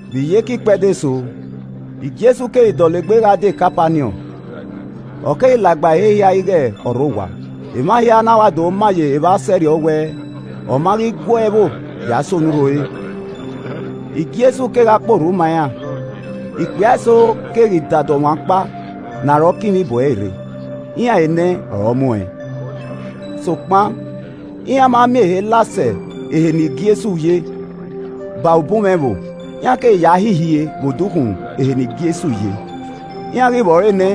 Vbe iyeke ikpẹdẹ eso, Jesu keghi dọlegbe gha die Kapaniọn, ọ keghi la gba ehe hia ighe ọ rre owa. Emwa hia na wa do ma ye evba sẹrriọ wẹ ọ ma ghi gua ẹvbo ya sẹ onurho ore. Jesu kegha kpe orhu ma iran. Ikpia eso keghi dada ọmwa ọkpa ne arọ kinmwi bu ẹre rre, iran enẹ ọre ọ mu ẹn. Sokpan iran ma miẹn ehe la sẹ ehe ne Jesu ye baẹmwẹ ubunmwẹ ẹvbo. Iran keghi ya ha ihie vbe odukhunmwu ehe ne Jesu ye. Iran ghi vbẹ ọre nẹ,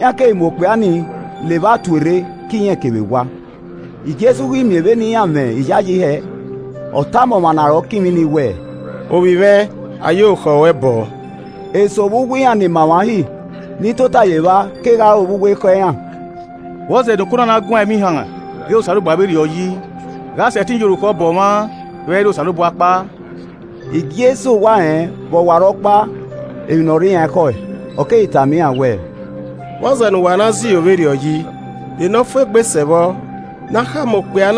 iran keghi mu okpia ni la evba tuorre ke irẹn kevbe ewa. Jesu ghi miẹn vbene iran mwẹ iyayi hẹ, ọ tama ọmwa ne arọ kinmwi ni wẹ, “Ovbi mwẹ, a ye orukhọ ruẹ bọọ.” Eso vbe uwu iran ni ma emwa Uhi ni tota ye evba kegha ro vbe uwu ekhọe iran, “Vbọzẹ ne oko na na guan ẹmwẹ ihan ghe Osanobua vberriọ yi? Gha ọ sẹtin ya orukhọ bọ ọmwa vbe ẹ i re Osanobua ọkpa!” Jesu wa rẹn vbe ọwarọkpa emwi ne ọ rre iran ekhọe, ọ keghi tama iran wẹẹ, “Vbọzẹ ne uwa na zẹ iro vberriọ yi? De ne ọ fu egbe sẹ vbọ? Ne a khama okpia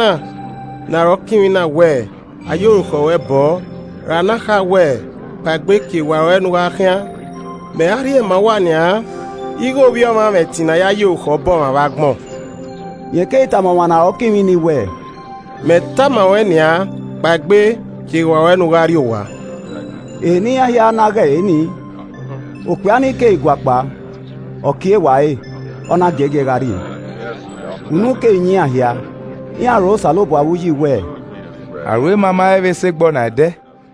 ne arọ kinmwi na wẹ, ‘A ya orukhọ ruẹ bọọ,’ ra ne a kha wẹ, ‘Kpaegbe, kie ewa ruẹ ne u gha khian?’ Mẹ ra rhie ma uwa nian ighe Ovbi Ọmwa mwẹ ẹtin ne a ya ye orukhọ bọ ọmwa vbe agbọn.” Rẹn keghi tama ọmwa ne arọ kinmwi ni wẹẹ, “Mẹ tama ruẹn nian, kpaegbe, kie ewa ruẹ ne u gha rrie owa.” Ehe ne iran hia na ghe ẹre nii, okpia ni keghi guakpao, ọ kie ewa ẹre, ọ na giẹgiẹ gha rrie. Unu keghi yan iran hia, iran rho Osanobua vbe uyi wẹẹ, “Aro ima ma he vbe sẹ egbe ọna ẹdẹ.”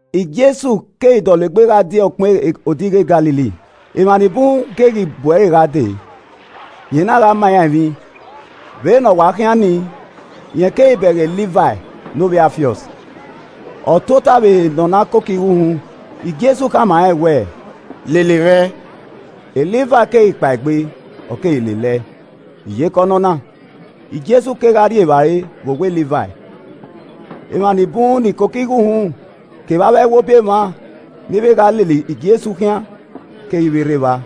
Jesu keghi dọlegbe gha die ọkpẹn odighi e Galili, Emwa ni bun keghi hu ẹre gha dee, rẹn na gha ma iran emwi. Vbene ọ wa khian nii, rẹn keghi bẹghe Livai ne ovbi Alfiọs, ọ tota vbe ehe ne ọ na koko igho uhunmwu. Jesu khama rẹn wẹ, “Lele mwẹ” Livai keghi kpaegbe, ọ keghi lele ẹe. Iyeke ọnọna, Jesu kegha rri evbare vbe owa Livai. Emwa nibun ni koko igho uhunmwu kevbe avbe ẹwobi emwa ni vbe gha lele Jesu khian keghi vbe rre evba,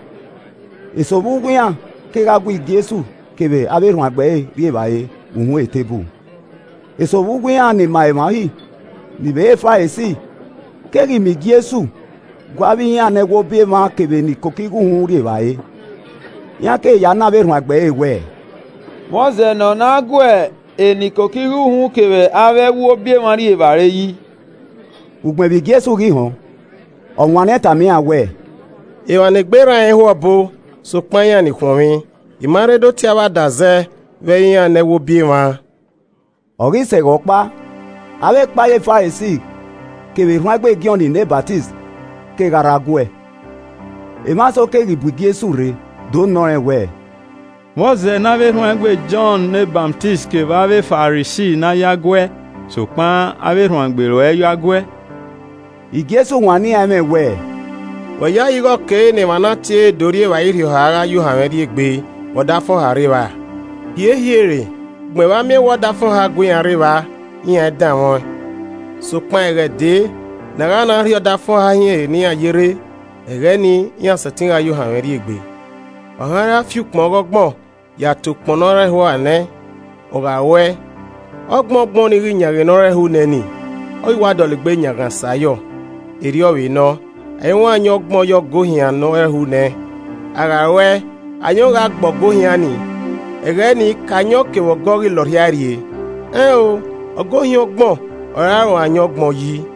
eso vbe uwu iran kegha gu Jesu kevbe avbe erhuanegbe ẹre rri evbare vbe uhunmwu eteburu. Eso vbe uwu iran ni ma emwa Uhi, ni vbe re Farisi keghi miẹn vbe Jesu gu avbe iran ne ẹwobi emwa kevbe ni koko igho uhunmwu rri evbare, iran keghi ya nọ avbe erhuanegbe ẹre wẹẹ, “Vbọzẹ ne ọ na gu eni koko igho uhunmwu kevbe avbe, ẹwobi emwa rri evbare yi?” Ugbẹn vbe Jesu ghi họn, ọ wanniẹn tama iran wẹẹ, “Emwa ne egbe rran rẹn i ho ọbo, sokpan iran ni khuọnmwi. I ma rre do tie avbe adazẹ vbe ẹ i re iran ne ẹwobi emwa.” Ọ ghi sẹ ẹghẹ ọkpa, avbe ekpayẹ Farisi kevbe erhuanegbe Jọn ne Ọsamẹ kegha rre aguẹ. Emwa eso keghi bu Jesu rre do nọ rẹn wẹẹ, “Vbọzẹ ne erhuanegbe Jọn ne Ọsamẹ kevbe avbe Farisi na yo aguẹ sokpan avbe erhuanegbe ruẹ i yo aguẹ?” Jesu wanniẹn iran ẹmwẹ wẹẹ, “Wẹ yayi ighe ọ kere ne emwa ne a tie do rri evbare irhiọha gha ya ohanmwẹ rriegbe vbe ọdafẹn ọha rre evba? Hiehie re. Ugbẹn vbe a miẹn wẹ ọdafẹn ọha gue iran rre evba, iran i danmwẹ ọẹn. Sokpan ẹghẹ dee ne a gha na rhie ọdafẹn ọha hin ehe ne iran ye rre, ẹghẹ ni, iran sẹtin gha ya ohanmwẹ rri egbe. “Ọmwa i ra fian ukpọn ọgbọngbọn ya te ukpọn nẹ ọ rẹnhuan nẹ, ọ gha ruẹe, ọgbọngbọn nii ghi yanghan ne ọ rẹnhuan nẹ nii, ọ ghi wa dọlegbe yanghan sayọ. Erriọ vbe nọ, a i ruẹn ayọn ọgbọn ye ọgọ ohian ne ọ rẹnhuan nẹ, a gha ruẹe, ayọn gha gbe ọgọ ohian nii, ẹghẹ ni ke ayọn kevbe ọgọ ghi la ọrhiae rrie. Ẹn o, ọgọ ohian ọgbọn ọre a vbe ruẹn ayọn ọgbọn yi.”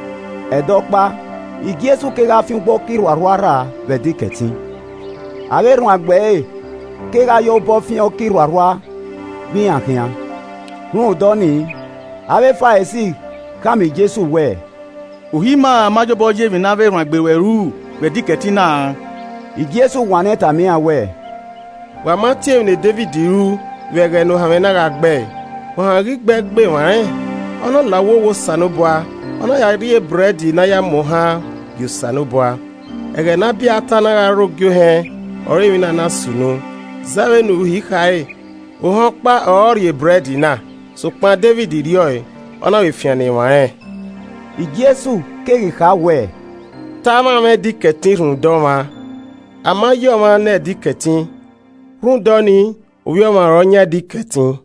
Ẹdẹ ọkpa, Jesu kegha fian ugbo ọka irhuarhua rra vbe Ẹdẹ Ikẹtin. Avbe erhuanegbe ẹre kegha ya obọ fian ọka irhuarhua vbe iran khian. Rhunmwuda ọnii, avbe Farisi khama Jesu wẹẹ, “Uhi ima ma ye obọ ye emwi ne avbe erhuanegbe ruẹ ru vbe Ẹdẹ Ikẹtin na.” Jesu wanniẹn tama iran wẹẹ, “Wa ma tie emwi ne Devid ru vbe ẹghẹ ne ohanmwẹ na gha gbe ẹe? Ohanmwẹ ghi gbe ẹe gbe emwa rẹn, Ọ na la uwu owa Osanobua, ọ na ya rri ebrẹd ne a ya muohan gie Osanobua. Ẹghẹ ne Abiata na gha re ogie ohẹn ọre emwi na na sunu, zẹ vbe ne uhi khare, ohẹn ọkpa ọre ọ rri ebrẹd na. Sokpan Devid rri ọe, ọ na vbe fian ne emwa rẹn.” Jesu keghi kha wẹẹ, “Te a mwamwa Ẹdẹ Ikẹtin rhunmwuda ọmwa, a ma yi ọmwa ne Ẹdẹ Ikẹtin. Rhunmwuda ọnii, Ovbi Ọmwa ọre ọ yan Ẹdẹ Ikẹtin.”